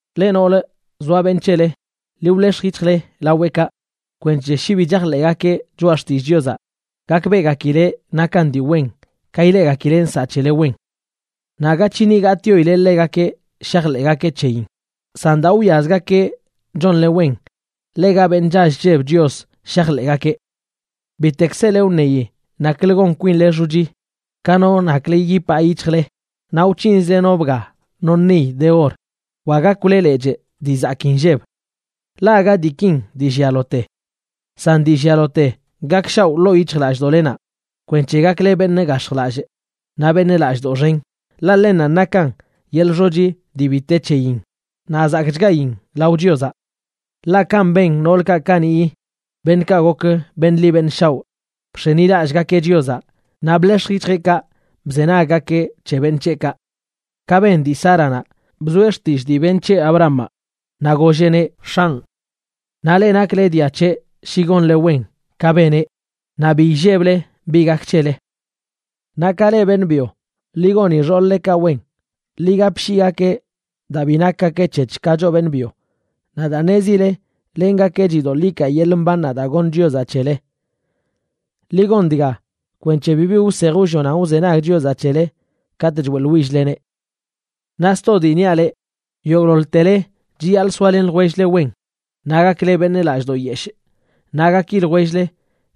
Leꞌ noolə zoa beṉꞌ c̱hele, ḻi wḻex̱j yic̱hjle laweꞌkaꞌ kwenc̱he shi bi chajḻeꞌgakeꞌ choꞌa xtillꞌ Chiozaꞌ, gakbeꞌgakileꞌ nakan dii wen ka ileꞌgakileꞌ nsaꞌ c̱hele wen. Naꞌ aga c̱hini gatꞌyoile ḻegakeꞌ shajḻeꞌgakeꞌ c̱heyin, san daa wwiazgakeꞌ chonle wen ḻega beṉꞌ chall chlleb Chios shajḻeꞌgakeꞌ. Bitek sele wṉeyi naklə gon kwinle xochi: ka no naklə yipaa yic̱hjle, naꞌ wc̱hinzle no bga no niy de or, wa gakwle lechꞌ dii zakii nlleb. Ḻaꞌ aga diikin dii llialote. San dii llialote gakshaoꞌ ḻoo yic̱hjlallꞌdoꞌlenaꞌ kwenc̱he gakle beṉꞌ gax̱jlallꞌ naꞌ beṉꞌ lallꞌdoꞌ xen, ḻaꞌ ḻennanꞌ nakan yeḻꞌ xochi dii bi te c̱heyin naꞌ zakꞌchgayin lao Chiozaꞌ. Ḻaꞌ kanꞌ ben noolkaꞌ kaniꞌyi, beṉꞌkaꞌ gok beṉꞌ ḻi beṉꞌ shaoꞌ. Bx̱enilallꞌgakeꞌ Chiozaꞌ naꞌ bḻex̱j yic̱hjeꞌkaꞌ bzenaggakeꞌ c̱he beṉꞌ c̱heꞌkaꞌ. Ka ben dii Sáranaꞌ, bzoeꞌ xtillꞌ dii beṉꞌ c̱heꞌ, Abrahamaꞌ, naꞌ golleꞌneꞌ “x̱anꞌ”. Naꞌ leꞌ nakle dia c̱heꞌ shi gonle wen ka beneꞌ naꞌ bi illeble bi gak c̱hele. Naꞌ ka leꞌ beṉꞌ byo, ḻi goni xool-ḻekaꞌ wen. Ḻi gapshiigakeꞌ daa bi nakgakeꞌ c̱hec̱h ka choꞌ beṉꞌ byo, naꞌ daa ṉezile lengakenꞌ chidoḻꞌ ikaa yeḻꞌ mbannaꞌ daa goṉ Chiozaꞌ c̱hele. Ḻi gon dga kwenc̱he bibi wsej wllonan wzenag Chiozaꞌ c̱hele katꞌ choeꞌḻwill-leneꞌ. Naꞌ sto dii niaꞌ leꞌ, yogꞌḻoḻtele chiyaḻꞌ soalen ljwell-le wen, naꞌ gakle beṉꞌ lallꞌdoꞌ yeshꞌ, naꞌ gaki ljwell-le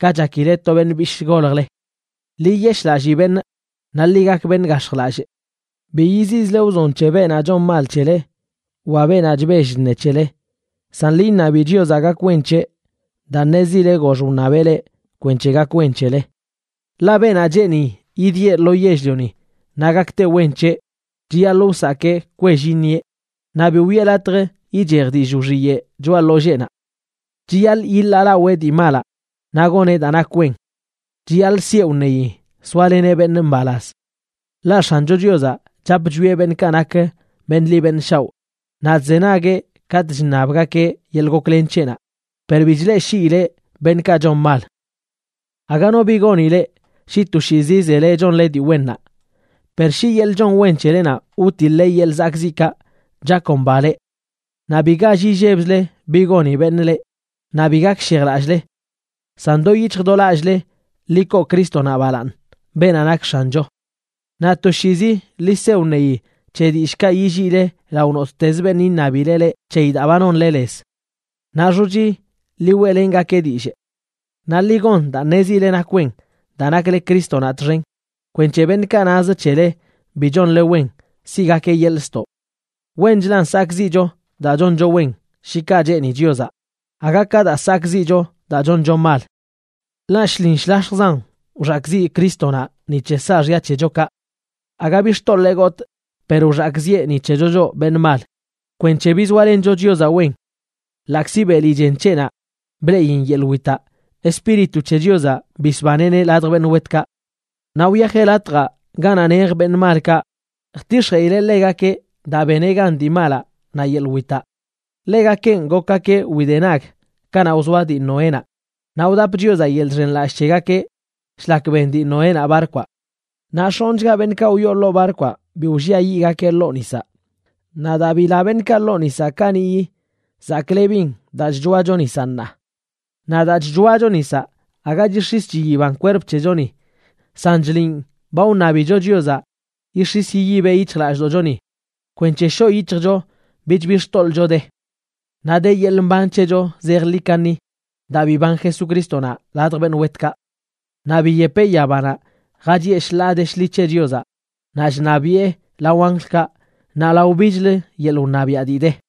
ka chakileꞌ to beṉꞌ bishꞌ goljle. Ḻi yiyeshꞌlallii beṉꞌ, naꞌ ḻi gak beṉꞌ gax̱jlallꞌ. Bi yiziꞌzle wzon c̱he beenaꞌ chon mal c̱hele wa beenaꞌ chbell chṉe c̱hele. San ḻi iṉabi Chiozaꞌ gak wen c̱heꞌ, daa ṉezile gox wṉabeꞌ leꞌ kwenc̱he gak wen c̱hele. Ḻaꞌ: Beenaꞌ cheeni idieꞌ lo yell-lioni naꞌ gakte wen c̱heꞌ, chiyaḻꞌ wsakee kwell iṉieꞌ, naꞌ bi wiꞌe latj ichej dillꞌ wxiyeꞌ choꞌa ḻolleenaꞌ. Chiyaḻꞌ yiḻaalawee dii malaꞌ, naꞌ goneꞌ daa nak wen. Chiyaḻꞌ sieꞌ wṉeyi soaleneꞌ beṉꞌ mbalaz. Ḻaꞌ X̱ancho Chiozaꞌ chap chwieꞌ beṉꞌkaꞌ nak beṉꞌ ḻi beṉꞌ shaoꞌ, naꞌ chzenagueꞌ katꞌ chṉabgakeꞌ yeḻꞌ goklen c̱heꞌnaꞌ, per bi chleꞌshiileꞌ beṉꞌkaꞌ chon mal. Aga no bi goni leꞌ shi toshiizi zele chonle dii wennaꞌ. Per shi yeḻꞌ chon wen c̱helenaꞌ wtiḻꞌle yeḻꞌ zakꞌziꞌkaꞌ, chakomba leꞌ. Naꞌ bi gall illebzle bi goni beṉꞌ leꞌ, naꞌ bi gakshejlallꞌle. San do yic̱hj do lallꞌle ḻi koo Crístonaꞌ balaaṉ, beenaꞌ nak X̱ancho. Naꞌ toshiizi ḻi se wṉeyi c̱he dillꞌkaꞌ yilliile lao nottezə beṉꞌ iṉabileꞌ leꞌ c̱heyi daa ba nonle lez. Naꞌ xochi ḻi weꞌlengakeꞌ dillꞌ. Naꞌ ḻi gon daa ṉezile nak wen daa nakle Crístonaꞌ txen, kwenc̱he beṉꞌkaꞌ naz c̱hele bi chonle wen siꞌgakeꞌ yeḻꞌ ztoꞌ. Wenchlan sakꞌziꞌcho daa choncho wen, shi kaꞌ cheeni Chiozaꞌ, aga ka daa sakꞌziꞌcho daa choncho mal. Ḻaꞌ shlin shlax̱jzan wxakꞌziꞌ Crístonaꞌ ni c̱he saaxya c̱hechokaꞌ. Aga bi xtoḻee gotꞌ, per wxakꞌziꞌe ni c̱hecho choꞌ beṉꞌ mal, kwenc̱he bizoalencho Chiozaꞌ wen. Ḻaꞌkzi beli chen c̱heꞌnaꞌ bleꞌin yeḻꞌ witaꞌ, Espíritu c̱he Chiozaꞌ bisbaneꞌneꞌ ladj beṉꞌ wetkaꞌ. Naꞌ wyajeꞌ latjaꞌ ganaꞌ nej beṉꞌ malkaꞌa jtix̱jeꞌileꞌ ḻegakeꞌ daa beneꞌ gan dii malaꞌ naꞌ yeḻꞌ witaꞌ. Ḻegakenꞌ gokgakeꞌ widenag kanaꞌ wzoa dii Noénaꞌ, naꞌ wdap Chiozaꞌ yeḻꞌ chxenlallꞌ c̱hegakeꞌ shlak ben dii Noénaꞌ barkwaꞌ. Naꞌ x̱onꞌchga beṉꞌkaꞌ wyoo ḻoo barkwaꞌ bi wlliayiꞌgakeꞌ ḻoo nisaꞌ. Naꞌ daa bila beṉꞌkaꞌ ḻoo nisaꞌ kaniꞌyi, zaklebin daa chchoacho nisaꞌ ṉaa. Naꞌ daa chchoacho nisaꞌ aga chix̱is chiyiban kwerp c̱hechoni, san chliꞌn ba wṉabicho Chiozaꞌ yix̱is yiyibeꞌ yic̱hjlallꞌdoꞌchoni kwenc̱he shoꞌ yic̱hjcho bich bi xtoḻꞌcho de. Naꞌ de yeḻꞌ mban c̱hecho zejḻi kaṉi daa biban Jesucrístonaꞌ ladj beṉꞌ wetkaꞌ. Naꞌ biyepeꞌ yabanaꞌ, jachiꞌe shḻaa de shḻi c̱he Chiozaꞌ naꞌ chṉabiꞌe lao anjlkaꞌ naꞌ lao bichlə yeḻꞌ wṉabiaꞌ dii de.